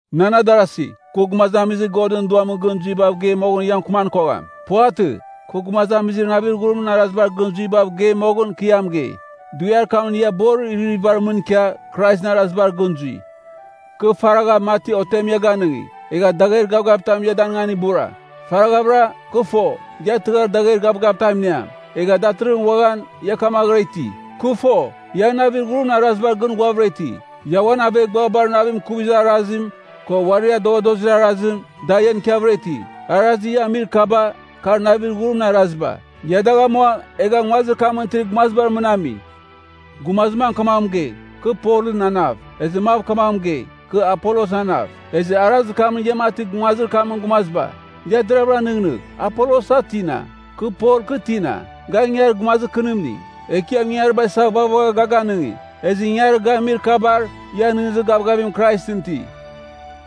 Nan adarasi, kɨ gumazamizir Godɨn Duamɨn gɨn zuibav gei moghɨn ia mɨkɨman kogham. Puvatɨ. Kɨ gumazamizir navir ghurimɨn arazibar gɨn zuibav geir moghɨn, kɨ ia mɨgei. Dughiar kamɨn ia borir iririvibar mɨn ikia, Kraisɨn arazibar gɨn zui. Kɨ faragha, mati otem ia ganɨngi, egha dagher gavgavitam ia danɨngan ibura. Faraghavɨra, kɨ fo, ia tɨghar dagher gavgavitam iniam. Egha datɨrɨghɨn uaghan, ia kamaghɨra iti. Kɨ fo, ia navir ghurimɨn arazibar gɨn ghuavɨra iti. Ia uan aveghbuabar navim ikuvir arazim, ko uarir adoghadozir arazim, da ian ikiavɨra iti. Arazir ia amir kaba, kar navir ghurimɨn araziba. Ia dagh amua, egha nguazir kamɨn itir gumazibar mɨn ami. Gumazir mam kamaghɨn mɨgei, “Kɨ Polɨn anav.” Ezɨ mav kamaghɨn mɨgei, “Kɨ Apolosɨn anav.” Ezɨ arazir kamɨn ia mati nguazir kamɨn gumaziba. Ia deravɨra nɨghnɨgh. Apolos, a tina? Kɨ Pol, kɨ tina? Ga ingangarir gumazir kɨnimning. Ekiam ingangariba isa, vaghvagha ga ganɨngi. Ezɨ ingangarir ga amir kabar, ia nɨghnɨzir gavgavim Kraisɨn iti.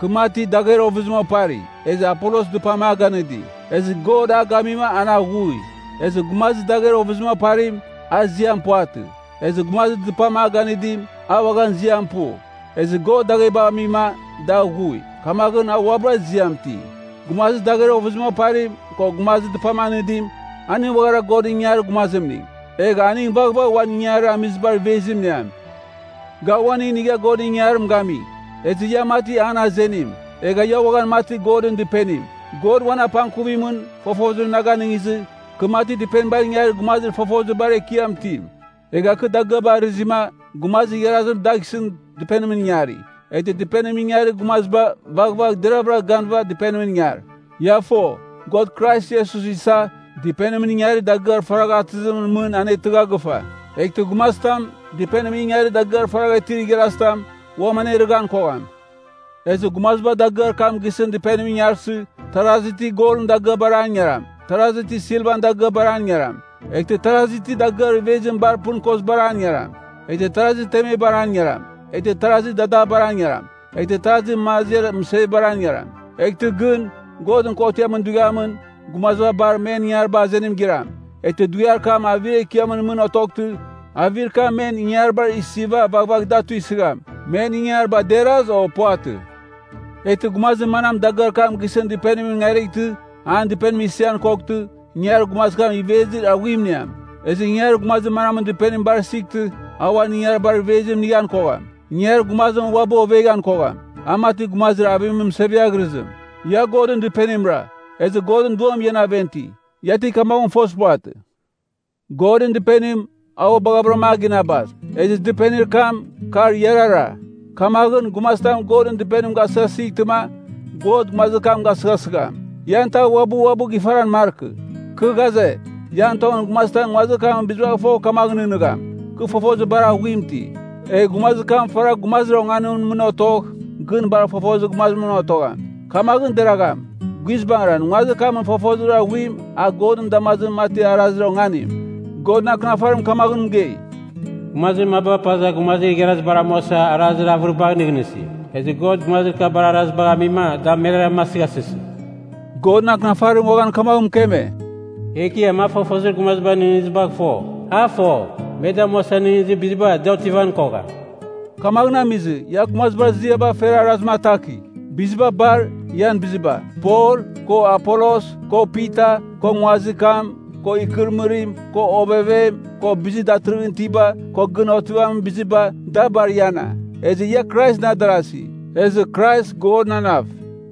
Kɨ mati, dagher ovɨzim opari. Ezɨ Apolos dɨpam a ganɨdi. Ezɨ God a gamima, an aghui. Ezɨ gumazir dagher ovɨzim oparim, a ziam puvatɨ. Ezɨ gumazir dɨpam a ganɨdim, a uaghan ziam pu. Ezɨ God daghebagh amima, da aghui, kamaghɨn a uabɨra ziam iti. Gumazir dagher ovɨzim oparim, ko gumazir dɨpam anɨdim, aning uaghara Godɨn ingangarir gumazimning. Egh aning vaghvagh uan ingangarir amizibar ivezim iniam. Ga uaning inigha Godɨn ingangarim gami, ezɨ ia mati an azenim. Egha ia uaghan mati Godɨn Dɨpenim. God uan apangkuvimɨn, fofozim na ganɨngizɨ, kɨ mati dɨpenibar ingarir gumazir fofozir bar ekiam itim. Egha kɨ dagɨaba arɨzima, gumazir igharazim dagh isɨn dɨpenimɨn ingari. Eghtɨ dɨpenimɨn ingarir gumaziba vaghvagh deravɨra ganɨva dɨpenimɨn ingar. Ia fo, God Krais Iesus isa, dɨpenimɨn ingarir dagɨar faragha atɨzimɨn mɨn anetɨgha gɨfa. Eghtɨ gumazitam, dɨpenimɨn ingarir dagɨar faragha itir igharazitam, uam anerɨghan kogham. Ezɨ gumaziba dagɨar kam gisɨn dɨpenimɨn ingarsɨ, tarazi ti golɨn dagɨabar an ingaram, tarazi ti silvan dagɨabar an ingaram, eghtɨ tarazi ti dagɨar ivezim bar pɨn kozibar an ingaram, eghtɨ tarazi temebar an ingaram, eghtɨ tarazi dadabar an ingaram, eghtɨ tarazi maziar mɨsiabar an ingaram. Eghtɨ gɨn, Godɨn Kotiamɨn Dughiamɨn, gumaziba bar, men ingangariba azenim giram. Eghtɨ dughiar kam avir ekiamɨn mɨn otoghtɨ, avir kam men ingangaribar isiva vaghvagh da tuisɨgham, men ingangariba deraz, o puvatɨ. Eghtɨ gumazir manam dagɨar kam gisɨn dɨpenimɨn ingarightɨ, an dɨpenim isian koghtɨ, ingangarir gumazir kam ivezir aghuim iniam. Ezɨ ingangarir gumazir manamɨn dɨpenim bar isightɨ, a uan ingangaribar ivezim inighan kogham. Ingangarir gumazim uabɨ ovengan kogham, a mati gumazir avimɨn mɨseviaghɨrɨzim. Ia Godɨn Dɨpenimra, ezɨ Godɨn Duam ian aven iti. Ia ti kamaghɨn fozir puvatɨ? Godɨn Dɨpenim, a ua baghavɨram a ginabas. Ezɨ dɨpenir kam, kar iarara. Kamaghɨn, gumazitam Godɨn Dɨpenim gasɨghasightɨma, God gumazir kam gasɨghasɨgham. Ian tav uabɨ uabɨ gifaran markɨ. Kɨ ghaze, ian tongɨn gumazitam nguazir kamɨn bizibagh fogh kamagh nɨghnɨgham, “Kɨ fofozir bar aghuim iti,” egh gumazir kam faragh gumazir onganimɨn mɨn otogh, gɨn bar fofozir gumazimɨn otogham. Kamaghɨn deragham. Guizbangɨra, nguazir kamɨn fofozir aghuim, a Godɨn damazimɨn mati arazir onganim. Godɨn Akɨnafarim kamaghɨn mɨgei, “Gumazir maba paza gumazir igharazibar amuasa, arazir avɨribagh nɨghnɨsi. Ezɨ God gumazir kabar arazibagh amima, da meraram asɨghasɨsi.” Godɨn Akɨnafarim uaghan kamaghɨn mɨkeme, “Ekiam a fofozir gumazibar nɨghnɨzibagh fo. A fo, me damuasa nɨghnɨzir biziba, da otivan kogham.” Kamaghɨn amizɨ, ia gumazibar ziaba fer arazim atakigh. Biziba bar, ian biziba. Pol, ko Apolos, ko Pita, ko nguazir kam, ko ikɨrɨmɨrim, ko ovevem, ko bizir datɨrɨghɨn itiba, ko gɨn otivamin biziba, da bar iana. Ezɨ ia Kraisɨn adarasi, ezɨ Krais, Godɨn anav.